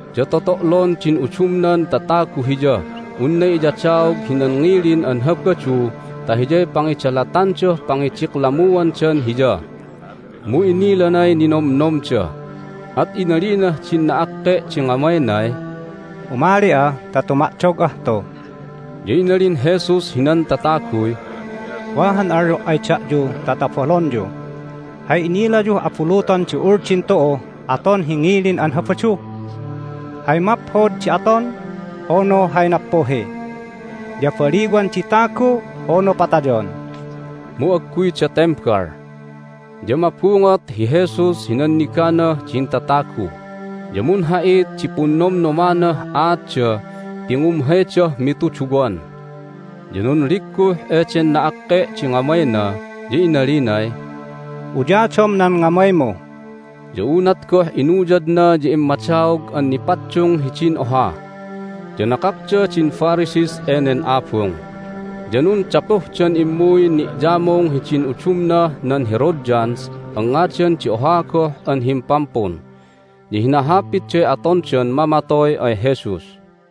Ya toto'lon din udumnan tatagu Hiyah unna iyadaog hinan ngilin an Habadu ta hiyay pangidalatandah pangidiklamuandan Hiya. Mu inilanay ninomnomda, at inalinah din na'akke' di ngamaynay, "Umali'a ta tuma'dog'ah tu." Ya inalin Jesus hinan tataguy, "Wa han alyo' ay da'yu ta tobalonyu. Hay inilayuh abuluton di Uldin tu'uh aton hi ngilin an Habadu? Hay maphod di aton, unu hay nappuhi? Ya baliwan di tagu, unu patayon?" Mu agguyda tembal. Ya mabungot hi Jesus hi nanniganah din tatagu, ya munha'it di punnomnomanah aatda ti ngumhaydah mituduwan. Ya nunligguh eden na'akke' di ngamayna, ya inalinay, "Uyadom nan ngamaymu!" Ya unat goh inuyadna ya immadaog an nipaddung hidin oha. Ya nakakda din Pharisees enen abung, ya nundapuhdan immuy ni'yamung hidin udumnah nan Herodians an ngadan di oha goh an himpampun, ya hinahapitday atondan mamatoy ay Jesus.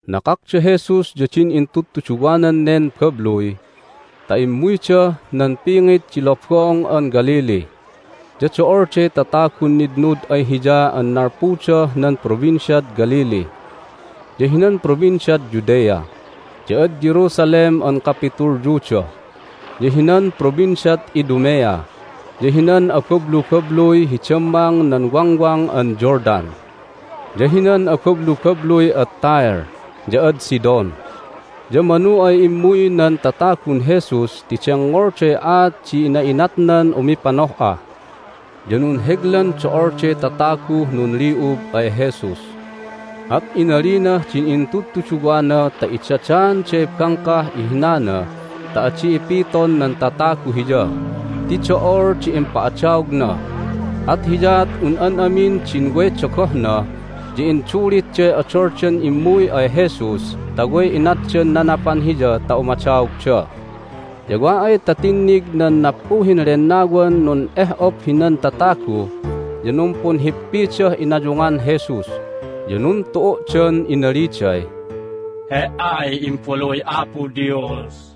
Nakak da Jesus ya din intudtuduwanan nen babluy ta immuydah nan pingit di Lobong an Galilee. Ya do'olday tatagun nitnud ay Hiya an nalpudah nan Provinciad Galilee, ya hinan Provinciad Judea, ya ad Jerusalem an kapitulyuda, ya hinan Provinciad Idumea, ya hinan abablubabluy hi dammang nan Wangwang an Jordan, ya hinan abablubabluy ad Tyre ya ad Sidon. Ya manu ay immuy nan tatagun Jesus ti dengngolday aat di ina'inatnan umipanoh'a. Ya nunheglan do'olday tataguh nunli'ub ay Jesus. At inalinah din intudtuduwana ta idadaanday bangkah ihinana ta adi ipiton nan tatagu Hiya ti do'ol di impa'adaogna, at hiyaat un an amin din way dogohna ya indulitday odoldan immuy ay Jesus ta way inatdan nanapan Hiya ta umadaogda. Ya wa ay ta tinnig nan nappuhin lennawan nun'eh'op hinan tatagu ya numpunhippidah inayungan Jesus, ya nuntu'u'dan inaliday, "He"ay Imbaluy Apo Dios!"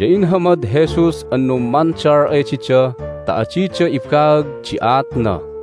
Ya inhamad Jesus an nummandal ay dida ta adida ibaag di aatna.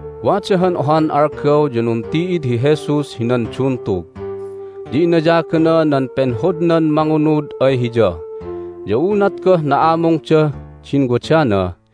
Wada han ohan algaw ya nunti'id hi Jesus hinan duntug, ya inayagana nan penhodnan mangunud ay Hiya. Ya unat goh na'amungdah din wadana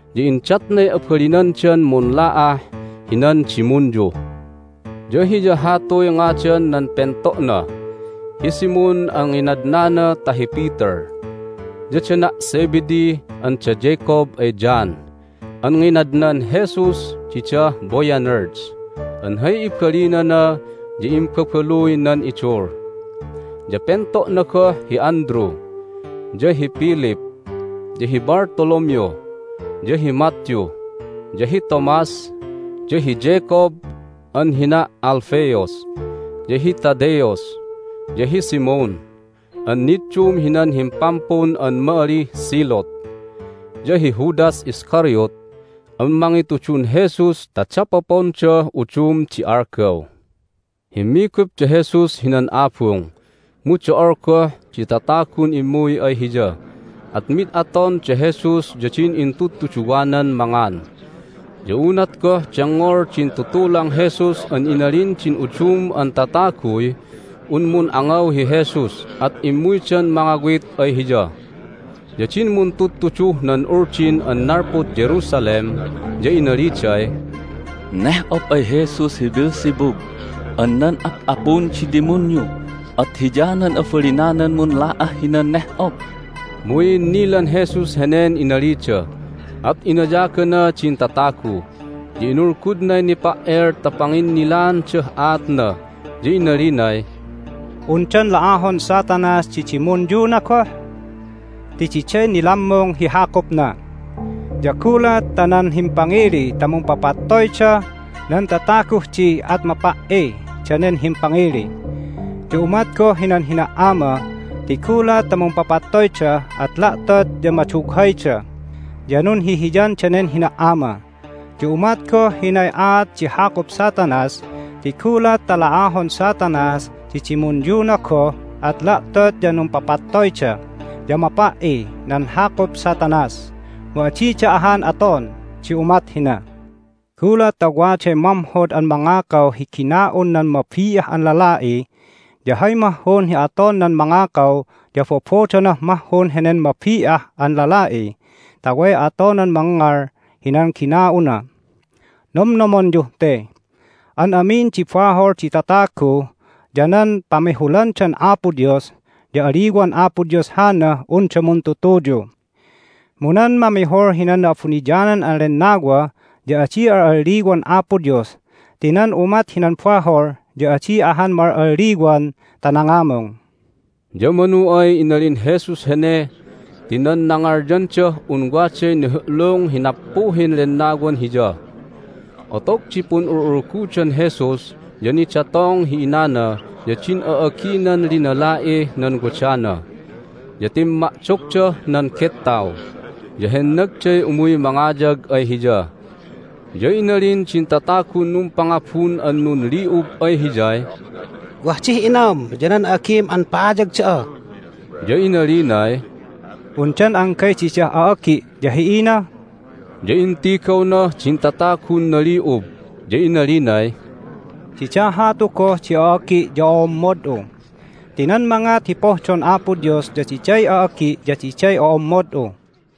ya indatnay abalinandan munla'ah hinan dimunyu. Ya hiya hatuy ngadan nan pento'na: hi Simon (an nginadnana ta hi Peter), ya dana' Zebedee an da Jacob ay John (an nginadnan Jesus didah Boanerges an hay ibalinana ya Imbabaluy nan Idul), ya pento'na goh hi Andrew, ya hi Philip, ya hi Bartholomew, ya hi Matthew, ya hi Thomas, ya hi Jacob (an hina' Alphaeus), ya hi Thaddaeus, ya hi Simon (an niddum hinan himpampun an ma'alih Zealot), ya hi Judas Iscariot (an mangitudun Jesus ta dapopondah udum di algaw). Himmigup da Jesus hinan abung, mu do'ol goh di tatagun immuy ay Hiya, at mid aton da Jesus ya din intudtuduwanan mangan. Ya unat goh dengngol din tutulang Jesus an inalin din udum an tataguy un mun'angaw hi Jesus at immuydan mangawit ay Hiya. Ya din muntudtuduh nan Uldin an nalpud Jerusalem ya inaliday, "Neh'op ay Jesus hi Beelzebub an nan ap'apun di dimunyu, at hiyanan abalinanan munla'ah hinan neh'op!" Mu i'innilan Jesus henen inalida, at inayagana din tatagu, ya inulgudnay nipa"el ta panginnilaandah aatna, ya inalinay, "Undan la'ahon Satanas di dimunyuna goh? Ti diday nilammung hi hakupna! Ya gulat ta nan himpangili ta mumpapatoyda nan tataguh di at mapa"i danen himpangili! Ya umat goh hinan hina"ama ti gulat ta mumpapattoyda at la'tot ya madughayda, ya nunhihiyan danen hina"ama! Ya umat goh hinay aat di hakup Satanas ti gulat ta la'ahon Satanas di dimunyuna goh at la'tot ya numpapattoyda, ya mapa"i nan hakup Satanas! Mu adida ahan aton di umat hina. Gulat ta waday mamhod an mangakaw hi gina'un nan mabi'ah an lala'i ya hay mahhun hi aton nan mangakaw ya bobodonah mahhun henen mabi'ah an lala'i ta way atonan mangngal hinan gina'una. Nomnomonyuh te: an amin di bahol di tatagu ya nan pamihulandan Apo Dios ya aliwan Apo Dios hanah unda muntutuyu. Mu nan mamihul hinan Na'abuniyanan an Lennawa ya adi al'alliwan Apo Dios ti nan umat hinan bahol ya adi ahan ma'al'alliwan ta nangamung." Ya manu ay inalin Jesus hene ti nan nangalyandah un waday nihu'lung hi nappuhin lennawan Hiya. Otog di pun'ul'ulgudan Jesus ya nidatong hi inana ya din a'aginan linala'ih nan wadana, ya timma'dogdah nan gettaw, ya hennagday umuy mangayag ay Hiya. Ya inalin din tatagun numpangabun an nunli'ub ay Hiyay, "Wah dih inam ya nan a'agim an pa'ayag da'a!" Ya inalinay, "Undan anggay didah a'agi' ya hi ina?" Ya intigawnah din tatagun nali'ub, ya inalinay, "Dida hatu goh di a'agi' ya o'ommod'u! Ti nan mangat hi pohdon Apo Dios ya diday a'agi', ya diday ommod'u!"